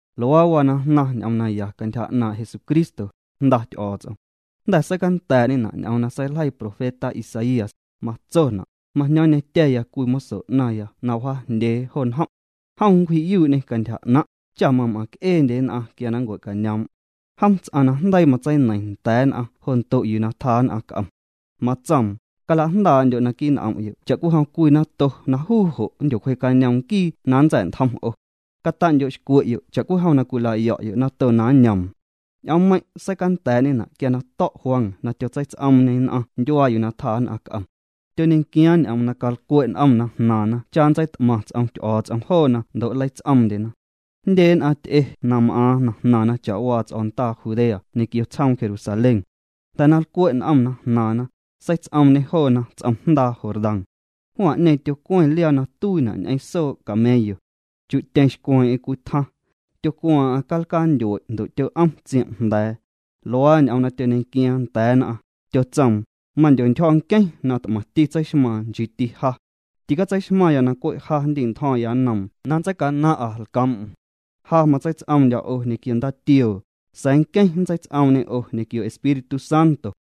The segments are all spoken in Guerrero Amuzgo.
Luaa waa na jnaⁿ ñ'oom naya cantyja 'naaⁿ' Jesucristo, Jnda Ty'o̱o̱ts'om. Jnda̱ seicanda̱a̱'ñena' ñ'oom na seiljeii profeta Isaías, matsona': Majño̱o̱ⁿñetya̱ya cwii moso 'naⁿya na wjaajndyee jo njom'. Jom nncwji'yuu'ñê cantyja 'naⁿ', cha mam'aⁿc'eendye nn'aⁿ quia na nncue'cañoom'. Jom ts'aⁿ na jndeii matseineiⁿ nda̱a̱ nn'aⁿ jo ndo' yuu tjaa nn'aⁿ c'om. Matsoom: “Calajndaa'ndyo' naquii' n'om'yo' cha'cwijom cwii nato na juu jo' nndyocwjee'cañoom nquii na nntsa̱'ntjom 'o. Cata'ndyo'xcwe'yo' cha'cwijom cwilayo̱'yo' nato na nñoom.” Ñ'oommeiⁿ' seicanda̱a̱'ñena' quia na to̱' Juan na tyotseits'oomñê nn'aⁿ ndyuaa yuu tjaa nn'aⁿ c'om. Tyoñequiaaⁿ ñ'oom na calcwe' n'omna jnaaⁿna cha nntseit'maⁿ ts'om Ty'o̱o̱ts'om joona ndo' nleits'oomndyena. Jndye nn'aⁿ ty'e na m'aaⁿ na jnaⁿna cha'waa ts'o̱ndaa Judea ñequio tsjoom Jerusalén. Jnda̱ na lcwe' n'omna jnaaⁿna, seits'oomñê joona ts'om jndaa Jordán. Juan'ñeeⁿ tyocweⁿ liaa na tuiina' ñ'eⁿ soo' camello. Chi'tyeⁿ xcweeⁿ'eⁿ cwii tjaⁿ. Tyocwaaⁿ'aⁿ calcaa ntyue' ndo' tyo'om tsiom' jnda̱a̱. Luaa ñ'oom na tyoñequiaaⁿ nda̱a̱ nn'aⁿ, tyotsoom: —Mandyontyjo̱ nqueⁿ na t'maⁿti tseixmaaⁿ, nchiiti ja. Ticatseixmaⁿya na cwe' ja nndi'ntjo̱ⁿya nnoom na nntseicanaⁿ'a lcoom'm. Ja matseits'oomndyo̱ 'o ñequio ndaatioo, sa̱a̱ nqueⁿ nntseits'oomñê 'o ñequio Espíritu Santo.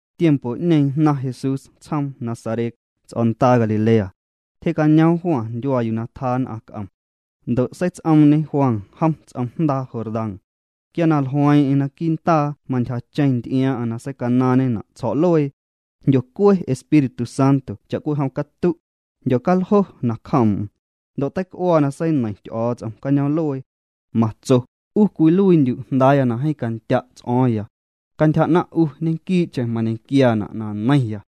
Tiempo'ñeeⁿ jnaⁿ Jesús tsjoom Nazaret, ts'o̱ndaa Galilea. Tyje'cañoom Juan ndyuaa yuu na tjaa nn'aⁿ c'om. Ndo' seits'oomñe Juan jom ts'om jndaa Jordán. Quia na jlueeⁿ'eⁿ naquii' ndaa mantyjacheⁿ nty'iaaⁿ'aⁿ na seicanaaⁿñena' tsjo̱'luee. Jndyocue Espíritu Santo cha'cwijom catu'. Jndyocaljo nacjoom'm. Ndo' teic'uaa na seineiⁿ Ty'o̱o̱ts'om cañoom'luee. Matso: —'U cwiluiindyu' Jndaaya na jeeⁿ candya' ts'o̱o̱ⁿya. Cantyja 'naⁿ' 'u ñequii'cheⁿ mañequiaana' na neiⁿya.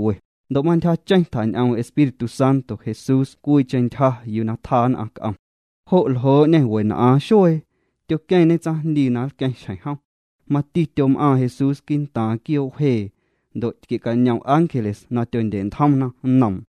Ndo' mantyjacheⁿ tjañ'oom Espíritu Santo Jesús cwiicheⁿ ntyja yuu tjaa nn'aⁿ c'om. Jo' ljoo'ñê wen'aaⁿ xuee. Tyoqueⁿñe tsaⁿjndii na nlqueⁿ xjeⁿ jom. Mati tyom'aaⁿ Jesús quii'ntaaⁿ quioo' wjee. Ndo' tquie'cañom ángeles na tyondye'ntjomna nnoom.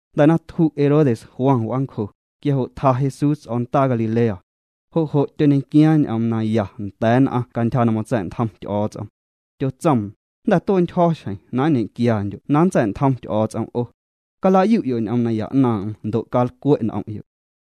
Jnda̱ na tju' Herodes Juan w'aancjo, quia jo' tja Jesús ts'o̱ndaa Galilea. Jo' jo' tyoñequiaaⁿ ñ'oom naya nda̱a̱ nn'aⁿ cantyja na matsa̱'ntjom Ty'o̱o̱ts'om. Tyotsoom: —Jnda̱ tue'ntyjo̱ xjeⁿ na nñe'quiandyo' na nntsa̱'ntjom Ty'o̱o̱ts'om 'o. Calayu'yo' ñ'oom naya 'naaⁿ'aⁿ ndo' calcwe' n'om'yo'.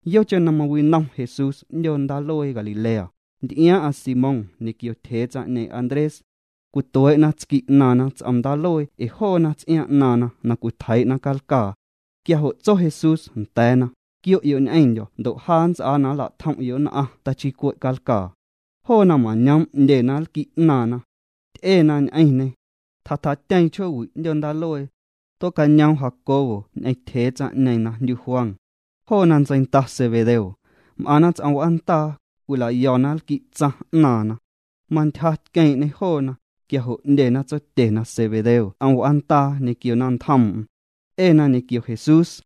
Yocheⁿ na mawinom Jesús 'ndyoo ndaaluee Galilea, nty'iaaⁿ'aⁿ Simón ñequio tyjee tsaⁿ'ñeeⁿ Andrés. Cwituee'na tsqui' 'naaⁿna ts'om ndaaluee ee joona ts'iaaⁿ 'naaⁿna na cwitjeii'na calcaa. Quia jo' tso Jesús nda̱a̱na: —Quio'yo' ñ'eⁿndyo̱ ndo' ja nnts'aa na nlatjom'yo' nn'aⁿ tachii cwe' calcaa. Joona mañoom' 'ndyena lqui' 'naaⁿna. Ty'ena ñ'eⁿñê. Tjatjatyeeⁿ chjoowi' 'ndyoo ndaaluee. Tuee'cañoom Jacobo ñ'eⁿ tyjee tsaⁿ'ñeeⁿ na jndyu Juan. Joona ntseinda Zebedeo. M'aⁿna ts'om w'aandaa, cwila'yo̱na lqui'tsaⁿ 'naaⁿna. Mantyja tqueeⁿ'ñê joona, quia jo' 'ndyena tsotyena Zebedeo ts'om w'aandaa ñequio naⁿntjoom'm. Ty'ena ñequio Jesús.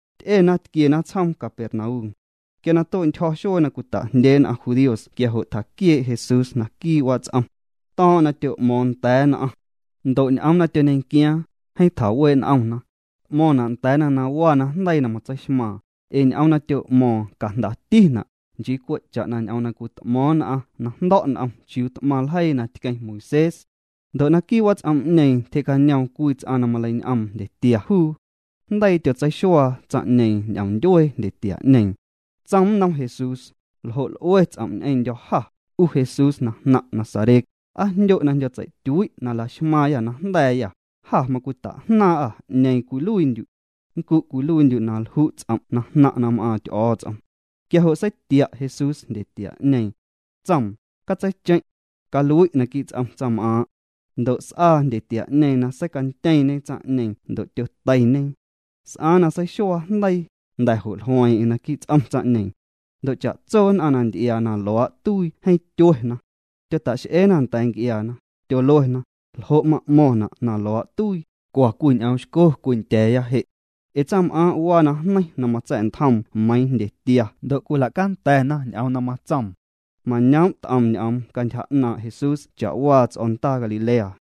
Ty'ena tquiena tsjoom Capernaum. Quia na tue'ntyjo̱ xuee na cwita'jndyee nn'aⁿ judíos quia jo' tjaquiee' Jesús naquii' wats'om. To̱o̱ⁿ'o̱ⁿ na tyo'mo̱o̱ⁿ nda̱a̱ nn'aⁿ. Ndo' ñ'oom na tyoñequiaaⁿ, jeeⁿ tjawee' n'omna. T'mo̱ⁿna' nda̱a̱na na waa najndeii na matseixmaaⁿ, ee ñ'oom na tyo'mo̱o̱ⁿ cajndatina', nchii cwe' cha'na ñ'oom na cwit'mo̱o̱ⁿ nn'aⁿ na jndo̱' n'om chiuu t'maⁿ ljeii na tqueⁿ Moisés. Ndo' naquii' wats'om'ñeeⁿ tyje'cañoom cwii ts'aⁿ na maleiñ'oom jndyetia juu. Jndeii tyotseixuaa tsaⁿ'ñeeⁿ ñ'oom ndyuee jndyetia'ñeeⁿ. Tsoom nnom Jesús: —¿Ljo' l'ue ts'om' ñ'eⁿndyô̱ jâ, 'u Jesús na jnaⁿ' Nazaret? ¿Aa jndyo' na jndyo'tsei'tyui' na laxmaaⁿyâ najnda̱a̱yâ? Jâ macwitajnaaⁿ'â 'ñeeⁿ cwiluiindyu'. Nncu' cwiluiindyu' na lju' ts'om' na jnaⁿ' na m'aaⁿ Ty'o̱o̱ts'om. Quia jo' seitia' Jesús jndyetia'ñeeⁿ. Tsoom: —Catseicheⁿ'. Calui' naquii' ts'om tsaⁿm'aaⁿ'. Ndo' s'aa jndyetia'ñeeⁿ na seicantyeeⁿñe tsaⁿ'ñeeⁿ ndo' tyoteiñe. S'aaⁿ na seixuaa jndeii, jnda̱ jo' jlueeⁿ'eⁿ naquii' ts'om tsaⁿ'ñeeⁿ. Ndo' cha'tso nn'aⁿ na nty'iaa na luaa' tuii jeeⁿ tyuena. Tyota'x'eena nda̱a̱ nc'iaana, tyoluena: —¿Ljo' ma'mo̱ⁿna' na luaa' tuii? Cwa cwii ñ'oom xco cwindya̱a̱ya je'. Ee tsaⁿm'aaⁿ' waa najneiⁿ na matsa̱'ntjoom meiⁿ jndyetia ndo' cwila'canda̱na ñ'oom na matsoom. Mañoom' t'om ñ'oom cantyja 'naaⁿ' Jesús cha'waa ts'o̱ndaa Galilea.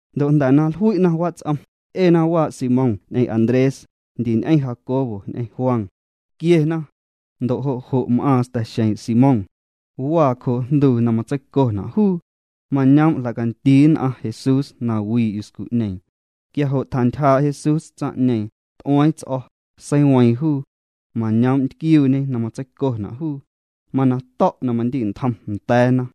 Ndo' jnda̱ na jlui'na wats'om, ty'ena waa' Simón ñ'eⁿ Andrés, ndi ñ'eⁿ Jacobo ñ'eⁿ Juan. Tquiena. Ndo' jo' jo' m'aaⁿ sta̱xeeⁿ' Simón. Waa cjoo' jnduu na matseicona' juu. Mañoom' jla'candii nn'aⁿ Jesús na wii' yuscu'ñeeⁿ. Quia jo' tjantyjaa' Jesús tsaⁿ'ñeeⁿ, t'ueeⁿ ts'o̱, seiweeⁿ juu. Mañoom' ntquiuuñe na matseicona' juu. Mana to̱' na mandintjom nda̱a̱na.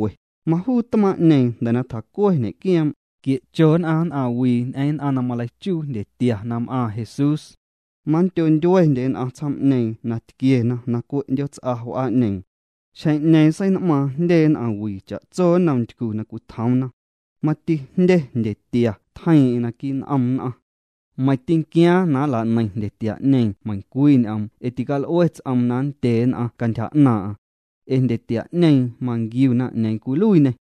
Majuu tmaaⁿ'ñeeⁿ jnda̱ na tjacue ñe'quioom', tquie'cho nn'aⁿ nn'aⁿwii ñ'eⁿ nn'aⁿ na maleichuu jndyetia na m'aaⁿ Jesús. Manndyo ndyuendye nn'aⁿ tsjoom'ñeeⁿ na tquiena na cwe' 'ndyoots'a w'aa'ñeeⁿ. Xjeⁿ'ñeeⁿ sein'maaⁿ jndye nn'aⁿwii cha'tso nnom ntycu na cwitjoomna. Mati jndye jndyetia tjeiiⁿ'eⁿ naquii' n'om nn'aⁿ. Meiⁿ tînquiaaⁿ na nla'neiⁿ jndyetia'ñeeⁿ meiⁿcwii ñ'oom ee tical'ue ts'oom na nndye nn'aⁿ cantyja 'naaⁿ'aⁿ. Ee jndyetia'ñeeⁿ manquiuna 'ñeeⁿ cwiluiiñê.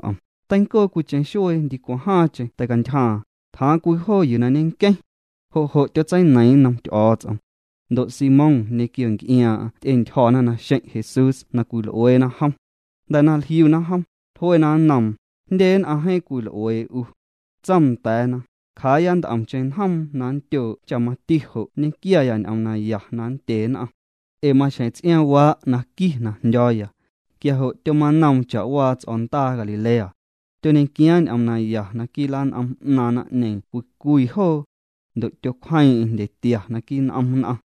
Teincoo cwiicheⁿ xuee ndicwaⁿ jaaⁿcheⁿ teicantyjaaⁿ, tjaaⁿ cwii joo yuu na ñenqueⁿ. Jo' jo' tyotseineiiⁿ nnom Ty'o̱o̱ts'om. Ndo' Simón ñequio nc'iaaⁿ'aⁿ ty'entyjo̱na naxeⁿ' Jesús na cwil'ueena jom. Jnda̱ na jliuna jom, jluena nnoom: —Jndye nn'aⁿ jeeⁿ cwil'uee 'u. Tsoom nda̱a̱na: —Cjaaya nt'omcheⁿ njoom na nndyoo' cha mati jo' nñequiaya ñ'oom naya na nndye nn'aⁿ. Ee maxjeⁿ ts'iaaⁿwaa' na qui na jndyo̱o̱ya. Quia jo' tyomanoom cha'waa ts'o̱ndaa Galilea. Tyoñequiaaⁿ ñ'oom naya naquii' lan'om 'naaⁿ naⁿ'ñeeⁿ cwii cwii joo. Ndo' tyocwjeeⁿ'eⁿ jndyetia naquii' n'om nn'aⁿ.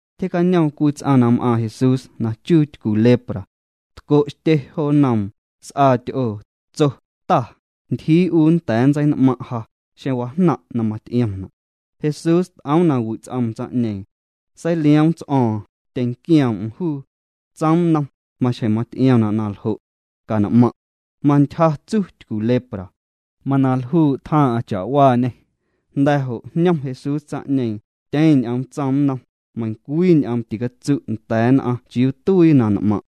Tyjee'cañoom cwii ts'aⁿ na m'aaⁿ Jesús na chuu tycu lepra. Tco'xtye jo nnoom, s'aa ty'oo, tso: —Ta, ntyjii 'u nnda̱a̱ nntsein'maⁿ' ja, xeⁿ wajnaⁿ' na maty'iomna'. Jesús t'oom na wi' ts'oom tsaⁿ'ñeeⁿ. Seilioom ts'o̱o̱ⁿ, tyeⁿnquioom'm juu. Tsoom nnom: —Maxjeⁿ maty'iomna' na ljo'. Can'maⁿ'. Mantyja tsu tycu lepra. Mana ljuu' tjaaⁿ'aⁿ cha'waañê. Jnda̱ jo' jñom Jesús tsaⁿ'ñeeⁿ, tyeⁿ ñ'oom tsoom nnom: —Meiⁿcwii ñ'oom ticatsu' nda̱a̱ nn'aⁿ chiuu tuii na n'maⁿ'.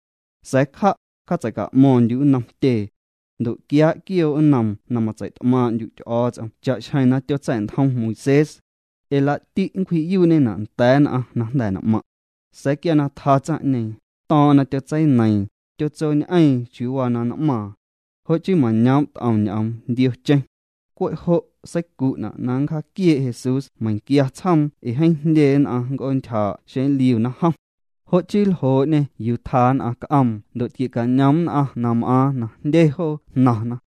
Sa̱a̱ cja', cja'tseica'mo̱ⁿndyu' nnom tyee. Ndo' quiaa' quioo' nnoom na matseit'maaⁿ'ndyu' Ty'o̱o̱ts'om cha'xjeⁿ na tyotsa̱'ntjom Moisés. Ee laa'ti' nncwji'yuu'ñena' nda̱a̱ nn'aⁿ na jnda̱ n'maⁿ'. Sa̱a̱ quia na tja tsaⁿ'ñeeⁿ, to̱o̱ⁿ'o̱ⁿ na tyotseineiiⁿ, tyotsoñ'eeⁿ chiuu waa na n'maaⁿ. Jo' chii mañoom' t'om ñ'oom ndiocheⁿ. Cwe' jo' seicu'na' na nncjaaquiee' Jesús meiⁿnquia tsjoom ee jeeⁿ jndye nn'aⁿ nnc'oontyjaa'na xeⁿ nliuna jom. Jo' chii ljoo'ñê yuu tjaa nn'aⁿ c'oom ndo' tquie'cañom nn'aⁿ na m'aaⁿ na jndye joo jnaⁿna.